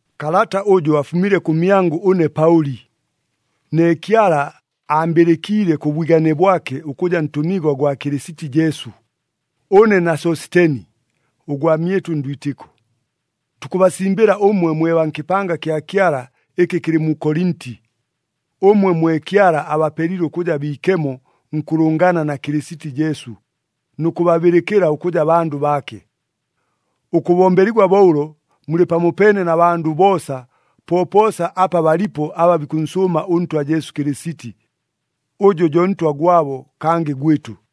Kalata ʉjʉ afumile kʉmyangʉ ʉne Paʉli, ne Kyala aambɨlɨkiile kʉ bwigane bwake ʉkʉja ntʉmigwa gwa Kɨlɨsiti Jesu. Ʉne na Sositeni, ʉgwamyɨtʉ ndwitɨko, tukʉbasimbɨla ʉmwe mwe baa nkɨpanga kya Kyala ɨkɨ kɨlɨ mu Kolinti, ʉmwe mwe Kyala abapelile ʉkʉja biikemo nkʉlʉngana na Kɨlɨsiti Jesu, nʉ kʉbabɨlɨkɨla ʉkʉja bandʉ baake. Ʉkʉbombeligwa bo ʉlo, mulɨ pamopeene na bandʉ boosa popoosa apa balipo aba bikʉnsʉʉma ʉNtwa Jesu Kɨlɨsiti, ʉjʉ jo Ntwa gwabo kangɨ gwɨtʉ.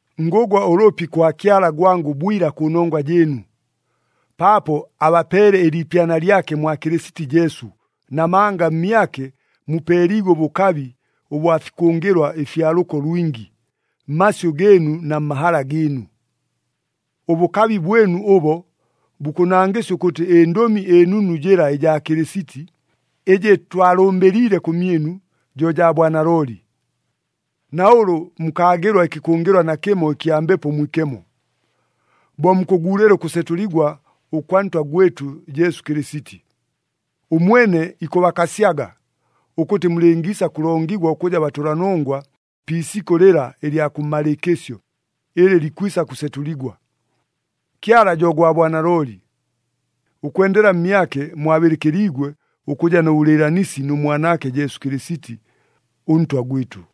Ngʉgwa ʉlʉpi kwa Kyala gwangʉ bwila kʉnongwa jɨɨnu, paapo abapeele ɨliipyana lyake mwa Kɨlɨsiti Jesu, namanga mmyake mupeeliigwe ʉbʉkabi ʉbwa fikʉngɨlwa ɨfya lʉko lwingi, mmasyʉ gɨɨnu na mmahala gɨɨnu. Ʉbʉkabi bwɨnu ʉbo, bukʉnangɨsya ʉkʉtɨ ɨNdʉmi ɨNunu jɨla ɨjaa Kɨlɨsiti, ɨjɨ twalʉmbɨliile kʉmyɨnu, jo jaa bwanalooli. Na ʉlʉ mukaagɨlwa ɨkɨkʉngɨlwa nakɨmo ɨkya Mbepo Mwikemo, bo mukʉguulɨla ʉkʉsetʉligwa ʉkwa Ntwa gwɨtʉ Jesu Kɨlɨsiti. Ʉmwene ikʉbakasyaga, ʉkʉtɨ mulɨngiisa kʉlongigwa ʉkʉja batʉlanongwa pi isikʉ lɨla ɨlya kʉmmalɨɨkɨsyo, ɨlɨ ikwisa kʉsetʉligwa. Kyala jo gwa bwanalooli. Ʉkwendela mmyake, mwabɨlɨkɨliigwe ʉkʉja nʉ bʉlɨɨlanisi nʉ Mwanaake Jesu Kɨlɨsiti, ʉNtwa gwɨtʉ.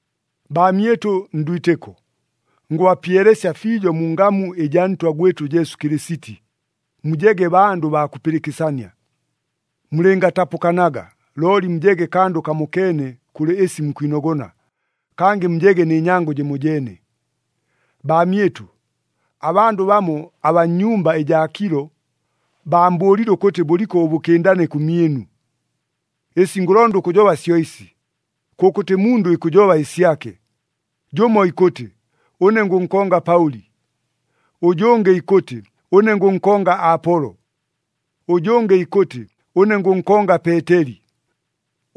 Baamyɨtʉ ndwitɨko, ngʉbapyelesya fiijo mu ngamu ɨjaa Ntwa gwɨtʉ Jesu Kɨlɨsiti, mujege bandʉ baa kʉpɨlɨkɨsania. Mulɨngatapʉkanaga, looli mujege kandʉ kamokeene kʉlɨ ɨsi mukwinogona, kangɨ mujege nɨ nyango jɨmojeene. Baamyɨtʉ, abandʉ bamo abaa nnyumba ɨjaa Kilo, baambʉʉlile ʉkʉtɨ bʉliko ʉbʉkɨndane kʉmyɨnu. Ɨsi ngʉlonda ʉkʉjoba syo ɨsi, kʉkʉtɨ mundʉ ikʉjoba ɨsyake. Jʉmo ikʉtɨ, “Ʉne ngʉnkonga Paʉli.” Ʉjʉngɨ ikʉtɨ, “Ʉne ngʉnkonga Apolo.” Ʉjʉngɨ ikʉtɨ, “Ʉne ngʉnkonga Peeteli.”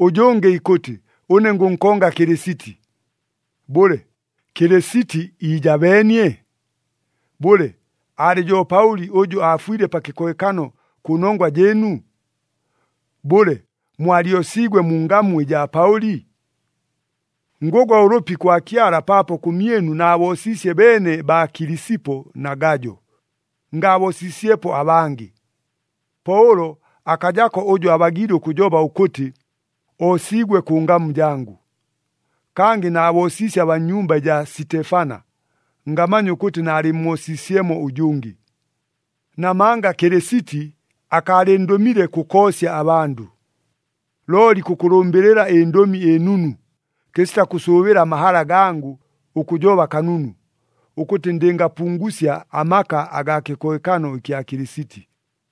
Ʉjʉngɨ ikʉtɨ, “Ʉne ngʉnkonga Kɨlɨsiti.” Bʉle, Kɨlɨsiti iijabeenie? Bʉle, aalɨ jo Paʉli ʉjʉ aafwile pa kɨkohekano kʉnongwa jɨɨnu? Bʉle, mwalyosiigwe mu ngamu ɨjaa Paʉli? Ngʉgwa ʉlʉpi kwa Kyala paapo kʉmyɨnu naaboosiisye beene baa Kilisipo na Gajo, ngaaboosiisyepo abangɨ. Po ʉlo akajako ʉjʉ abagiile ʉkʉjoba ʉkʉtɨ, oosiigwe kʉ ngamu jangʉ. (Kangɨ naaboosiisye abaa nnyumba ɨjaa Sitefana, ngamanya ʉkʉtɨ naalɨmmoosiisyemo ʉjʉngɨ.) Namanga Kɨlɨsiti akaalɨndʉmile kʉkoosya abandʉ, looli kʉkʉlʉmbɨlɨla ɨNdʉmi ɨNunu, kɨsita kʉsʉʉbɨla amahala gangʉ ʉkʉjoba kanunu, ʉkʉtɨ ndɨngapungusya amaka agaa kɨkohekano ɨkya Kɨlɨsiti.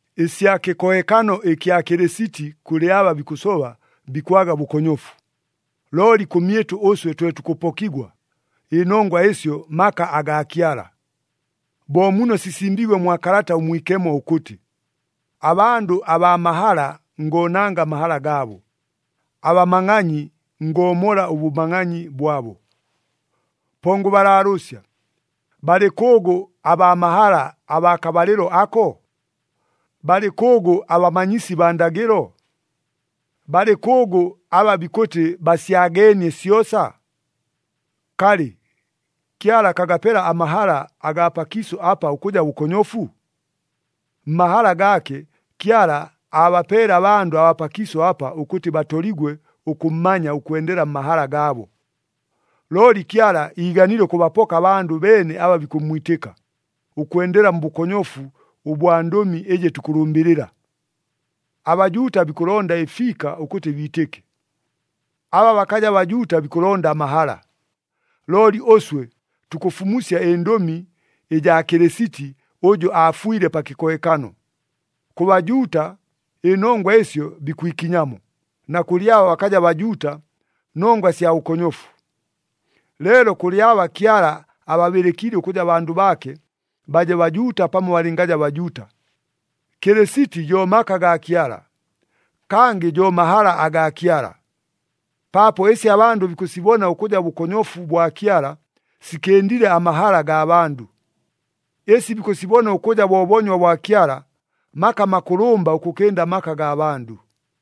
Ɨsya kɨkohekano ɨkya Kɨlɨsiti kʉlɨ aba bikʉsoba bikwaga bʉkonyofu, looli kʉmyɨtʉ ʉswe twe tukʉpokigwa, ɨnongwa ɨsyo maka agaa Kyala. Bo muno sisimbiigwe mwa Kalata ʉMwikemo ʉkʉtɨ, “Abandʉ abaa mahala ngoonanga amahala gaabo, abamangʼanyi ngoomola ʉbʉmangʼanyi bwabo.” Po ngʉbalaalʉʉsya, balɨ kʉʉgʉ abaa mahala abaa kabalɨlo ako? Balɨ kʉʉgʉ abamanyisi baa ndagɨlo? Balɨ kʉʉgʉ aba bikʉtɨ basyageenie syosa? Kalɨ, Kyala akagapela amahala agaa pakiisʉ apa ʉkʉja bʉkonyofu? Mmahala gaake, Kyala aabapeele abandʉ abaa pakiisʉ apa ʉkʉtɨ batoligwe ʉkʉmmanya ʉkwendela mmahala gaabo. Looli Kyala iiganile ʉkʉbapoka abandʉ beene aba bikʉmmwitɨka, ʉkwendela mbʉkonyofu ʉbwa ndʉmi ɨjɨ tukʉlʉmbɨlɨla! ABajuuta bikʉlonda ɨfiika ʉkʉtɨ biitɨke. Aba bakaja Bajuuta bikʉlonda amahala. Looli ʉswe, tukʉfumusya ɨNdʉmi ɨjaa Kɨlɨsiti ʉjʉ aafwile pa kɨkohekano. Kʉ Bajuuta, ɨnongwa ɨsyo bikwikinyamo, na kʉlɨ aba bakaja Bajuuta nongwa sya bʉkonyofu. Leelo kʉlɨ aba Kyala ababɨlɨkiile ʉkʉja bandʉ baake, baje Bajuuta pamo balɨngaja Bajuuta, Kɨlɨsiti jo maka gaa Kyala, kangɨ jo mahala agaa Kyala. Paapo ɨsi abandʉ bikʉsibona ʉkʉja bʉkonyofu bwa Kyala, sikɨndile amahala gaa bandʉ. Ɨsi bikʉsibona ʉkʉja bo boonywa bwa Kyala, maka makʉlʉmba ʉkʉkɨnda amaka gaa bandʉ.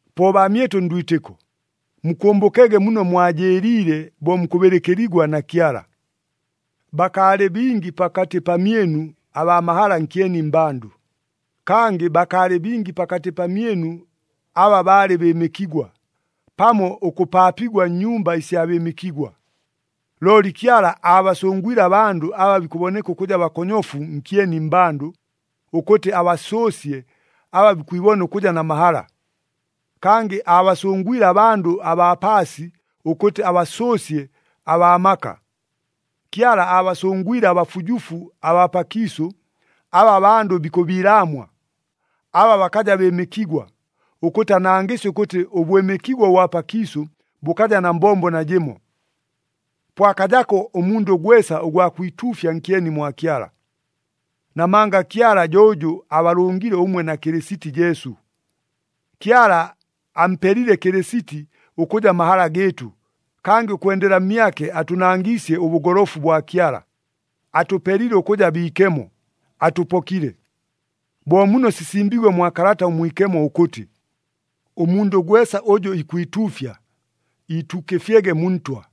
Po baamyɨtʉ ndwitɨko, mukʉmbʉkege muno mwajɨɨliile bo mukʉbɨlɨkɨligwa na Kyala. Bakaalɨ bingi pakatɨ pamyɨnu abaa mahala nkyeni mmbandʉ, kangɨ bakaalɨ bingi pakatɨ pamyɨnu aba baalɨ bɨɨmɨkigwa, pamo ʉkʉpaapigwa nnyumba ɨsya bɨɨmɨkigwa. Looli Kyala aabasʉngwile abandʉ aba bikʉboneka ʉkʉja bakonyofu nkyeni mmbandʉ, ʉkʉtɨ abasʉʉsye aba bikwibona ʉkʉja na mahala. Kangɨ aabasʉngwile abandʉ abaa paasi, ʉkʉtɨ abasʉʉsye abaa maka. Kyala aabasʉngwile abafujufu abaa pakiisʉ, aba abandʉ bikʉbiilaamwa, aba bakaja bɨɨmɨkigwa, ʉkʉtɨ anangɨsye ʉkʉtɨ ʉbwɨmɨkigwa ʉbwa pakiisʉ bʉkaja na mbombo najɨmo. Po akajako ʉmundʉ gwesa ʉgwa kwituufya nkyeni mwa Kyala. Namanga Kyala jo ʉjʉ abalʉngile ʉmwe na Kɨlɨsiti Jesu. Kyala ampelile Kɨlɨsiti ʉkʉja mahala gɨɨtʉ, kangɨ ʉkwendela mmyake atʉnangiisye ʉbʉgolofu bwa Kyala, atʉpelile ʉkʉja biikemo, atʉpokile. Bo muno sisimbiigwe mwa Kalata ʉMwikemo ʉkʉtɨ, “Ʉmundʉ gwesa ʉjʉ ikwituufya, iituukɨfyege mu Ntwa.”